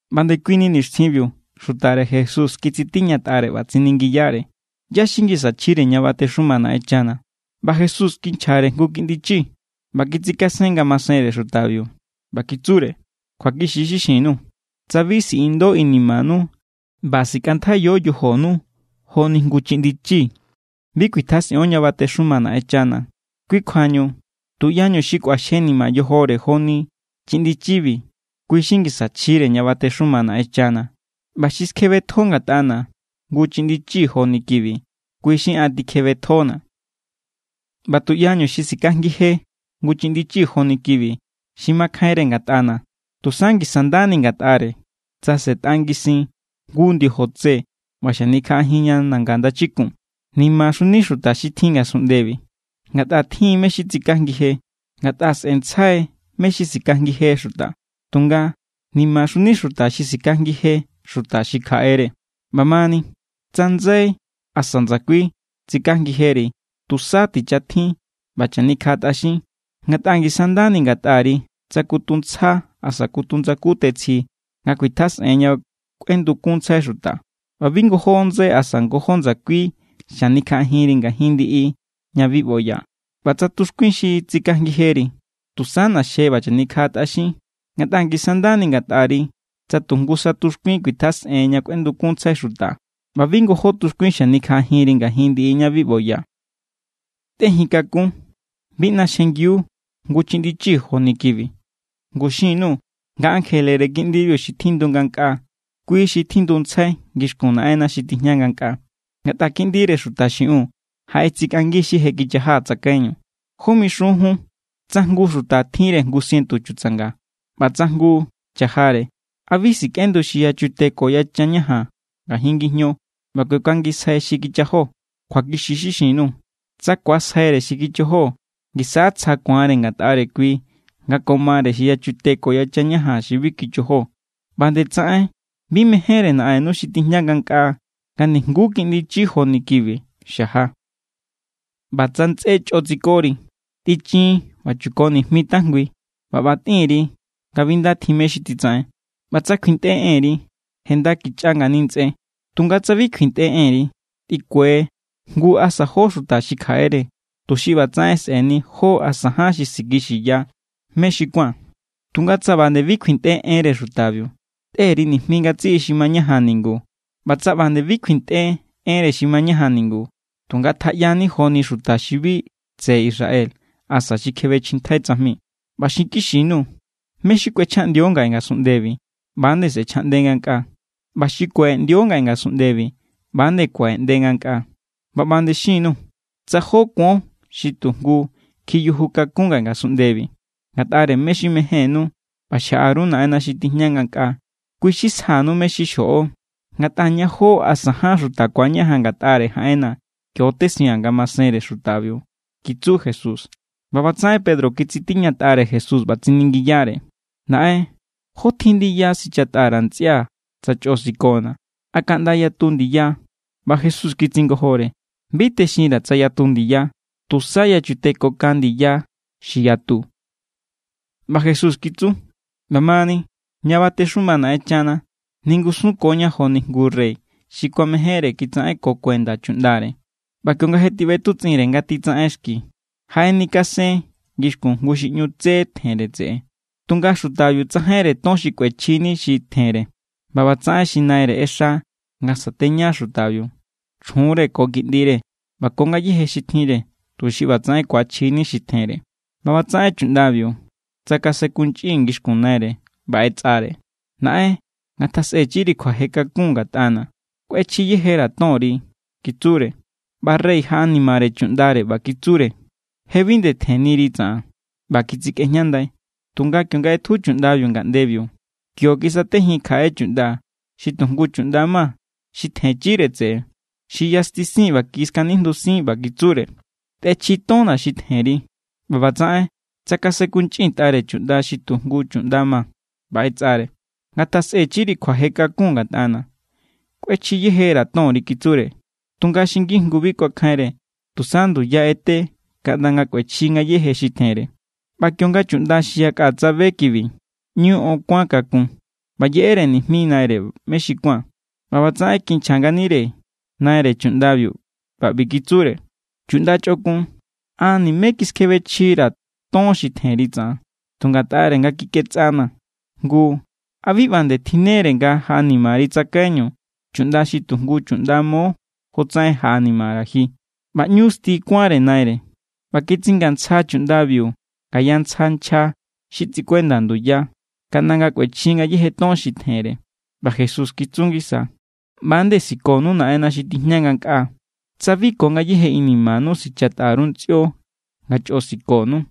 ꞌBa ndekuini nixtjinbiu xutare Jesús kitsitiñatꞌare ꞌba tsiningiyare: —¿ꞌYá= xi ngisa chjire ña batexuma Naꞌenchana? ꞌBa Jesús kinchjare jngu kiꞌndi chi ꞌba kitsikasen ngamasenre xutabiu, ꞌba kitsure: —Kjuakixi= xi xin_nuu̱. Tsa bi siꞌindo inimanu ꞌba sikꞌantjaiyo yojonu joni jngu chiꞌndi chi, bi kuitjasꞌion ña batexuma Naꞌenchana. Kui kjuañu, tuꞌyañu xi kꞌuaxjenima yojore joni chiꞌndi chibi, kui= xi ngisa chjire ña batexuma Naꞌenchana. ꞌBa xi skjebetjo ngatꞌana̱ jngu chiꞌndi chi joni kibi, kui xi an tikjebetjona̱. ’ꞌBa tuꞌyañu xi sikajngi je jngu chiꞌndi chi joni kibi xi makjainre ngatꞌana̱, tusa ngisa ndani ngatꞌare tsa sꞌe̱tꞌa ngisin jngu ndiojo tse ꞌba xanikjaꞌajin ña nanga ndachikun. ¡Nimaxuni xuta xi tjin ngasunꞌndebi, ngatꞌa tjin= mé= xi tsikajngi je! Ngatꞌa sꞌe̱ntsjai mé= xi sikajngi je xuta. Tunga, ¡nimaxuni xuta xi sikajngi je xuta xi kjaꞌere! ’ꞌBa mani, tsa ndsai asa ndsakui tsikajngijeri, tusa tichatjin ꞌba chanikjaꞌatꞌaxin. Ngatꞌa ngisa= ndani ngatꞌari tsa kutu ntsja asa kutu ndsaku tetsji nga kuitjasꞌen ña kꞌuendukunntsjai xuta, ꞌba bi ngojó ndsai asa ngojó ndsakui xanikjaꞌajinri ngajin ndiꞌi ña bi ꞌboya. ꞌBa tsa tuxkuin xi tsikajngijeri, tusa ꞌna̱xje ꞌba chanikjaꞌatꞌaxin. Ngatꞌa ngisa= ndani ngatꞌari tsa tu jngusa tuxkuin kuitjasꞌen ña kꞌuendukunntsjai xuta, ꞌba bi ngojó tuxkuin xanikjaꞌajinri ngajin ndiꞌi ña bi ꞌboya. ’Tꞌejin kakún. Bi ꞌnaxjengiu jngu chiꞌndi chi joni kibi. Ngu xin_nuu̱ nga ankjelere kiꞌndibiu xi tjindu ngankꞌaa, kui= xi tjinduntsjai ngixkun Naꞌenna̱ xi tijña ngankꞌaa. Ngatꞌa Kiꞌndire Xuta xiꞌiun jaꞌetsikꞌangi xi je kichaja tsakaiñu. ’¿Jó mixun jun? Tsa jngu xuta tjinre jngu sientu chutsanga, ꞌba tsa jngu cha̱jare, ¿a bi sikꞌendu xi yachute ko yachan ñajan ngajin ngijño ꞌba kuekangisjai xi kichajo? Kjuakixi= xi xin_nuu̱. Tsa ku̱asjaire xi kichajo, ngisa= tsja ku̱anre ngatꞌare kui, nga ko mare xi yachute ko yachan ñajan xi bi kichajo. ꞌBa nde tsaꞌen bi mejénre Naꞌennu xi tijña ngankꞌaa nga nijnguú kiꞌndi chi joni kibi xaja. ’ꞌBa tsa ntsꞌé chꞌo tsikori, tꞌichin ꞌba chuko nijmi tajngui ꞌba ꞌba tꞌin_ri nga bi nda tjin mé= xi titsaꞌen. ꞌBa tsa kjuintꞌe enri, je nda kichꞌa ngani ntsꞌé. Tunga tsa bi kjuintꞌe enri, tꞌikue jngu asa jó xuta xi kjaꞌere, tuxi ꞌbatsaꞌen sꞌe̱ni jó asa ján xi sikixiya mé= xi ku̱an. Tunga tsa ꞌba nde bi kjuintꞌe enre xutabiu, tꞌe_ri nijmi ngatsiꞌi xi mañajan ningu. ꞌBa tsa ꞌba nde bi kjuintꞌe enre xi mañajan ningu, tu ngatjaꞌyani joni xuta xi bi tseꞌe Israel asa xi kjebechjintjai tsajmi. ’ꞌBa xinkixi_nuu̱, mé= xi kꞌuechjaꞌndio ngaꞌe ngasunꞌndebi, ꞌba=nde sꞌe̱chjaꞌnde ngankꞌaa. ꞌBa xi kuaꞌeꞌndio ngaꞌe ngasunꞌndebi, ꞌba=nde kuaꞌeꞌnde ngankꞌaa. ’ꞌBa ꞌba nde xin_nuu̱. Tsa jó kuon xi tujngu kjiyuju kakún ngaꞌe ngasunꞌndebi ngatꞌare mé= xi mejénnú ꞌba xjaꞌa_ru Naꞌenna̱ xi tijña ngankꞌaa, kui= xi sjanu mé= xi xjoꞌo. Ngatꞌa ña jó asa ján xuta ku̱añajan ngatꞌare jaꞌenna̱, kio= tesiaa̱n ngamasenre xutabiu —kitsu Jesús. ꞌBa ꞌbatsaꞌen Pedro kitsitiñatꞌare Jesús ꞌba tsiningiyare: —Naꞌen, ¿jó tjin ndiya sichatꞌa_ra̱ ntsꞌia̱, tsa chꞌo sikona̱? ¿A kaꞌnda yatu ndiya? ꞌBa Jesús kitsingojore: —Bi texinra̱ tsa yatu ndiya, tusa yachute ko kan ndiya xi yatu. ꞌBa Jesús kitsu: —ꞌBa mani, ña batexuma Naꞌenchana, ningusunkoña joni jngu rey xi kuamejénre kitsaꞌenko kuenda chuꞌndare. ꞌBa kionga je tiꞌbetutsꞌinre nga titsaꞌen xki, jaꞌenikasen ngixkun jngu xi ꞌñu tsé tjenre tseꞌe. Tunga xutabiu tsajainre ton xi kꞌuechjini xi tjenre. ꞌBa ꞌbatsaꞌen xi naire ꞌexa nga sateña xutabiu, chjunre, ko kiꞌndire, ꞌba ko ngayéje xi tjinre, tuxi ꞌbatsaꞌen ku̱achjini xi tjenre. ꞌBa ꞌbatsaꞌen chuꞌndabiu tsakasenkunchꞌin ngixkun naire ꞌba ꞌetsꞌare: “Naꞌen, ngatjasꞌechiri kjuaje kakun ngatꞌana. Kꞌuechji yejera̱ tonri”, kitsure. ꞌBa rey jaꞌanimare chuꞌndare ꞌba kitsure: “Je bi nde tjenniri tsaꞌan.” ꞌBa kitsikꞌejñandai. Tunga kionga ꞌetju chuꞌndabiu ngaꞌndebiu, kio kisatejin kjaꞌe chuꞌnda xi tu jngu chuꞌnda ma xi tjenchire tseꞌe. Xi yastisin ꞌba kiskanijndusin ꞌba kitsure: “¡Tꞌechji tonna̱ xi tjenri!” ꞌBa ꞌbatsaꞌen tsakasenkunchꞌintꞌare chuꞌnda xi tu jngu chuꞌnda ma, ꞌba ꞌetsꞌare: “Ngatjasꞌechiri kjuaje kakun ngatꞌana̱. Kꞌuechjiyejera̱ tonri”, kitsure. Tunga xi ngijngu bi kuakjainre. Tusa nduya ꞌete kaꞌnda nga kꞌuechji ngayéje xi tjenre. ꞌBa kionga chuꞌnda xi yakꞌa tsabe kibi, ꞌñu on kuán kakun ꞌba yeꞌere nijmi naire mé xi kuán. ꞌBa ꞌbatsaꞌen kinchja nganire naire chuꞌndabiu ꞌba ꞌbi kitsure: “Chuꞌnda chꞌokun, an nimé kiskjebechjira̱ ton xi tjenri tsaꞌan, tu ngatꞌare nga kikꞌetsꞌanaa̱. Ngu, ¿a bi ꞌba nde tjinnere nga jaꞌanimari tsakaiñu chuꞌnda xi tu jngu chuꞌnda mo, jotsaꞌen jaꞌanimara̱ ji?” ꞌBa ꞌñu sti kuánre naire. ꞌBa kitsingantsja chuꞌndabiu ngaya ntsja nchja xi tsikuenda nduya, kaꞌnda nga̱ kꞌuechji ngayéje ton xi tjenre. ꞌBa Jesús kitsu ngisa: —ꞌBa=nde sikonu Naꞌenna̱ xi tijña ngankꞌaa, tsa bi ko ngayéje inimanu sichatꞌa_ru ntsꞌio nga chꞌo sikonu.